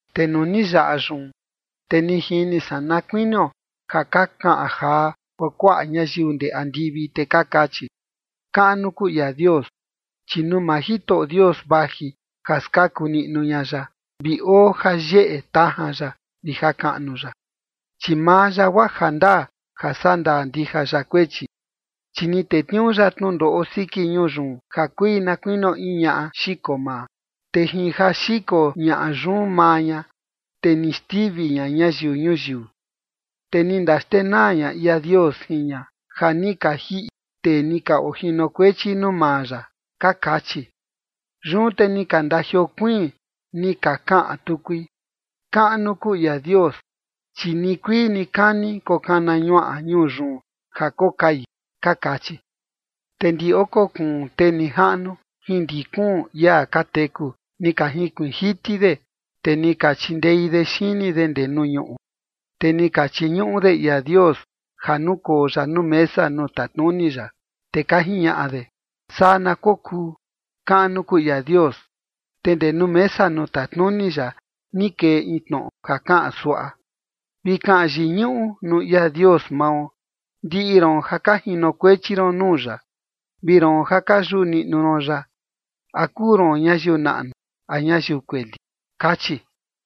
Te nuu ni yaꞌa yun, te ni jini san na kuinio ja ka kaꞌan jaa kuakuaꞌa ñayiu ndee andivi, te ka kachi: Kaꞌnu kuu ia Dios, chi nuu maa Jitoꞌo Dios vaji ja skaku niꞌnu ña ya, vi oo jayeꞌe tajan ya vi jakaꞌnu ya. Chi maa ya guaa jandaa ja sandaa ndija ya kuechi, chi ni tetniuu ya tnundoꞌo siki ñuu yun ja kui na kuinio in ñaꞌa xiko maa, te jin ja xiko ñaꞌa yun maa ña te ni xtivi ña ñayiu ñuyiu, te ni ndaxtenaa ña ia Dios jin ña ja ni ka jiꞌi tee ni ka ojinokuechi nuu maa ya. Ka kachi. Yun te ni ka ndajiokuiin ni ka kaꞌan tukui: Kaꞌnu kuu ia Dios, chi nikuii nikani kokana ñuaꞌa ñuu yun ja kokai. Ka kachi. Te ndi oko kuun tee nijaꞌnu jin ndi kuun ia ka teku ni ka jinkuiin jiti de, te ni ka chindei de xini de ndee nuu ñuꞌu, te ni ka chiñuꞌu de ia Dios ja nukoo ya nuu mesa nuu tatnuni ya. Te ka jiñaꞌa de: ―Saa na kokuu. Kaꞌnu kuu ia Dios. Te ndee nuu mesa nuu tatnuni ya ni kee in tnoꞌo ja kaꞌan suaꞌa: Vi kaꞌan yiñuꞌu nuu ia Dios mao, ndiꞌi roon ja ka jinokuechi ron nuu ya, vi roon ja ka yuꞌu niꞌnu ron ya, a kuu ron ñayiu naꞌnu a ñayiu kueli. Kachi.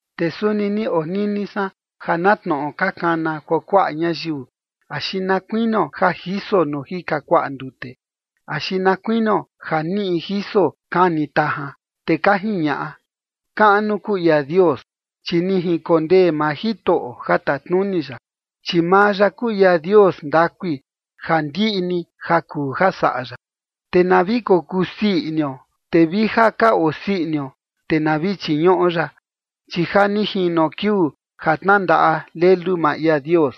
Te suni ni onini san ja na tnoꞌo ka kana kuakuaꞌa ñayiu, axi na kuinio ja jiso nuu jika kuaꞌa ndute, axi na kuinio ja niꞌi jiso kani tajan. Te ka jiñaꞌa: Kaꞌnu kuu ia Dios, chi ni jinkondee maa Jitoꞌo ja tatnuni ya, chi maa ya kuu ia Dios ndakui ja ndiꞌi ni ja kuu ja saꞌa ya. Te na vi kokuu sii inio, te vi ja ka osii inio, te na vi chiñuꞌo ya, chi ja ni jino kiuu ja tnandaꞌa Lelu maa ia Dios,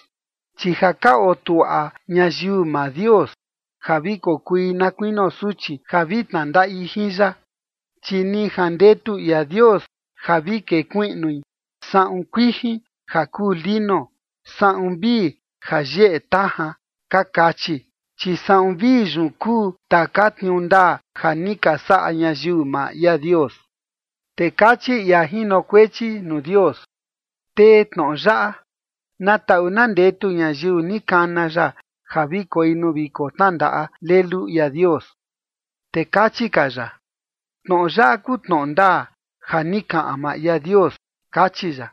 chi ja ka otuaꞌa ñayiu maa Dios ja vi kokui na kuinio suchi ja vi tnandaꞌi jin ya. Chi ni jandetu ia Dios ja vi kekuiꞌnui saꞌun kuijin ja kuu lino, saꞌun vii ja yeꞌe tajan. Ka kachi. Chi saꞌun vii yun kuu taka tniuu ndaa ja ni ka saꞌa ñayiu maa ia Dios. Te kachi ia jinokuechi nuu Dios: ―Tee tnoꞌo yaꞌa: “Na taꞌu na ndetu ñayiu ni kana ya ja vi koi nuu viko tnandaꞌa Lelu ia Dios”. Te kachi ka ya: ―Tnoꞌo yaꞌa kuu tnoꞌo ndaa ja ni kaꞌan maa ia Dios ―kachi ya.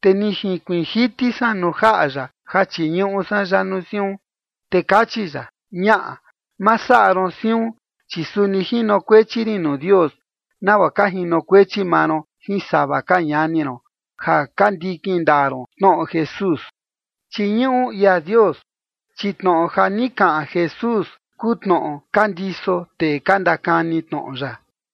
Te ni jinkuiin jiti san nuu jaꞌa ya ja chiñuꞌu san ya nuu siun. Te kachi ya: ―Ñaꞌa, ma saꞌa ron siun, chi suni jinokuechi rin nuu Dios nagua ka jinokuechi maa ron jin sava ka ñani ron ja ka ndikin ndaa ron tnoꞌo Jesús. Chiñuꞌu ia Dios, chi tnoꞌo ja ni kaꞌan Jesús kuu tnoꞌo ka ndiso tee ka ndakani tnoꞌo ya.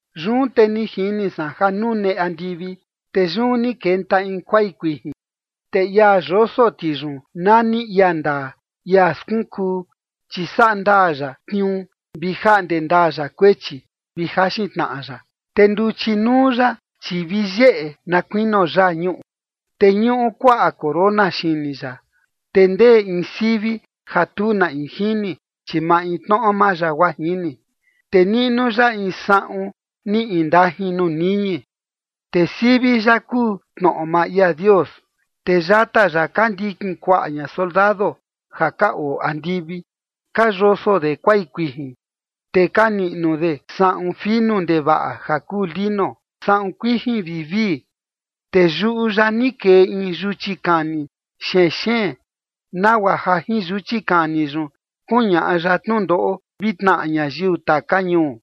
Yun te ni jini san ja nune andivi. Te yun ni kenta in kuai kuijin, te ia yoso ti yun nani ia ndaa, ia skunkuu, chi saꞌa ndaa ya tniuu vi jaꞌnde ndaa ya kuechi, vi jaxin tnaꞌa ya. Te nduchi nuu ya, chi vi yeꞌe na kuinio yaa ñuꞌu, te ñuꞌu kuaꞌa corona xini ya, te ndee in sivi ja tu na in jini, chi maintnoꞌo maa ya guaa jini. Te niꞌnu ya in saꞌun ni indajin nuu niñi, te sivi ya kuu: Tnoꞌo maa ia Dios. Te yata ya ka ndikin kuaꞌa ña soldado ja ka oo andivi ka yoso de kuai kuijin, te ka niꞌnu de saꞌun finu ndevaꞌa ja kuu lino saꞌun kuijin vivii. Te yuꞌu ya ni kee in yuchi kani xenxeen, nagua ja jin yuchi kani yun kuñaꞌa ya tnundoꞌo vi tnaꞌa ñayiu taka ñuu.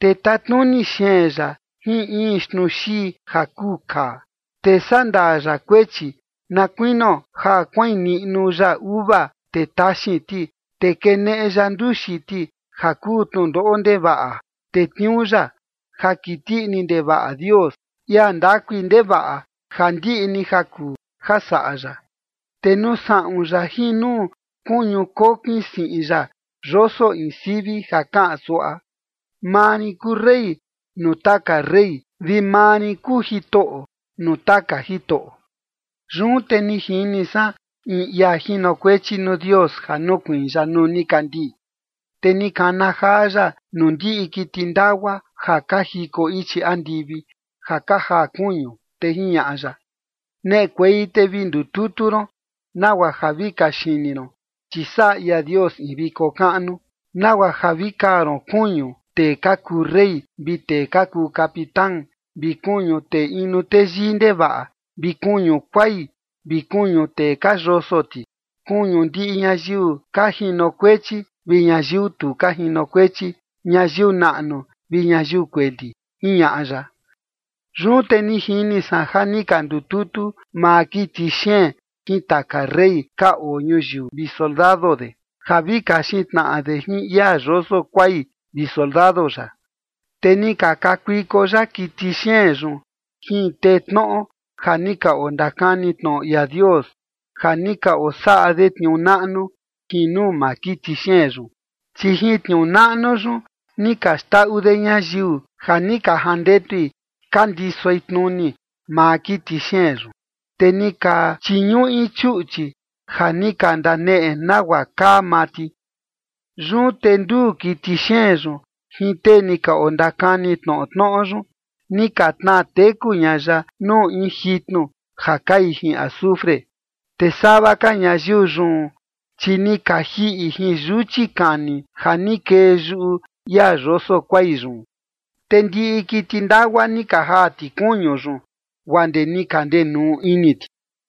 Te tatnuni xeen ya jin in xtnuxii ja kuu kaa, te sandaa ya kuechi na kuinio ja kuain niꞌnu ya uva, te taxin ti, te keneꞌe ya nduxi ti ja kuu tnundoꞌo ndevaꞌa tetniuu ya, ja kiti ini ndevaꞌa Dios, ia ndakui ndevaꞌa ja ndiꞌi ni ja kuu ja saꞌa ya. Te nuu saꞌun ya jin nuu kuñu kokin siꞌin ya yoso in sivi ja kaꞌan suaꞌa: “Maa rin kuu Rey nuu taka rey, vi maa rin kuu Jitoꞌo nuu taka jitoꞌo”. Yun te ni jini san in ia jinokuechi nuu Dios ja nukuiin ya nuu nikandii. Te ni kana jaa ya nuu ndiꞌi kiti ndagua ja ka jiko ichi andivi ja ka jaa kuñu, te jiñaꞌa ya: ―Neꞌekuei te vi ndututu ron, nagua ja vi kaxini ron, chi saꞌa ia Dios in viko kaꞌnu, nagua ja vi kaa ron kuñu tee ka kuu rey vi tee ka kuu capitán, vi kuñu tee inu teyii ndevaꞌa, vi kuñu kuai, vi kuñu tee ka yoso ti, kuñu ndiꞌi ñayiu ka jinokuechi vi ñayiu tu ka jinokuechi, ñayiu naꞌnu vi ñayiu kueli ―jiñaꞌa ya. Yun te ni jini san ja ni ka ndututu maa kiti xeen jin taka rey ka oo ñuyiu vi soldado de, ja vi kaxin tnaꞌa de jin ia yoso kuai vi soldado ya. Te ni ka kakuiko ya kiti xeen yun jin tee tnoꞌo ja ni ka ondakani tnoꞌo ia Dios ja ni ka osaꞌa de tniuu naꞌnu jin nuu maa kiti xeen yun. Chi jin tniuu naꞌnu yun ni ka xndaꞌu de ñayiu ja ni ka jandetui ka ndisoi tnuni maa kiti xeen yun. Te ni ka chiñuꞌi chuꞌchi ja ni ka ndaneꞌe nagua kaa maa ti. Yun te nduu kiti xeen yun jin tee ni ondakani tnoꞌo tnoꞌo yun, ni ka tnaa teku ña ya nuu in jitnu ja kai jin azufre. Te sava ka ñayiu yun, chi ni ka jiꞌi jin yuchi kani ja ni kee yuꞌu ia yoso kuai yun. Te ndiꞌi kiti ndagua ni ka jaa ti kuñu yun, guaa ndee ni ka ndenuu ini ti.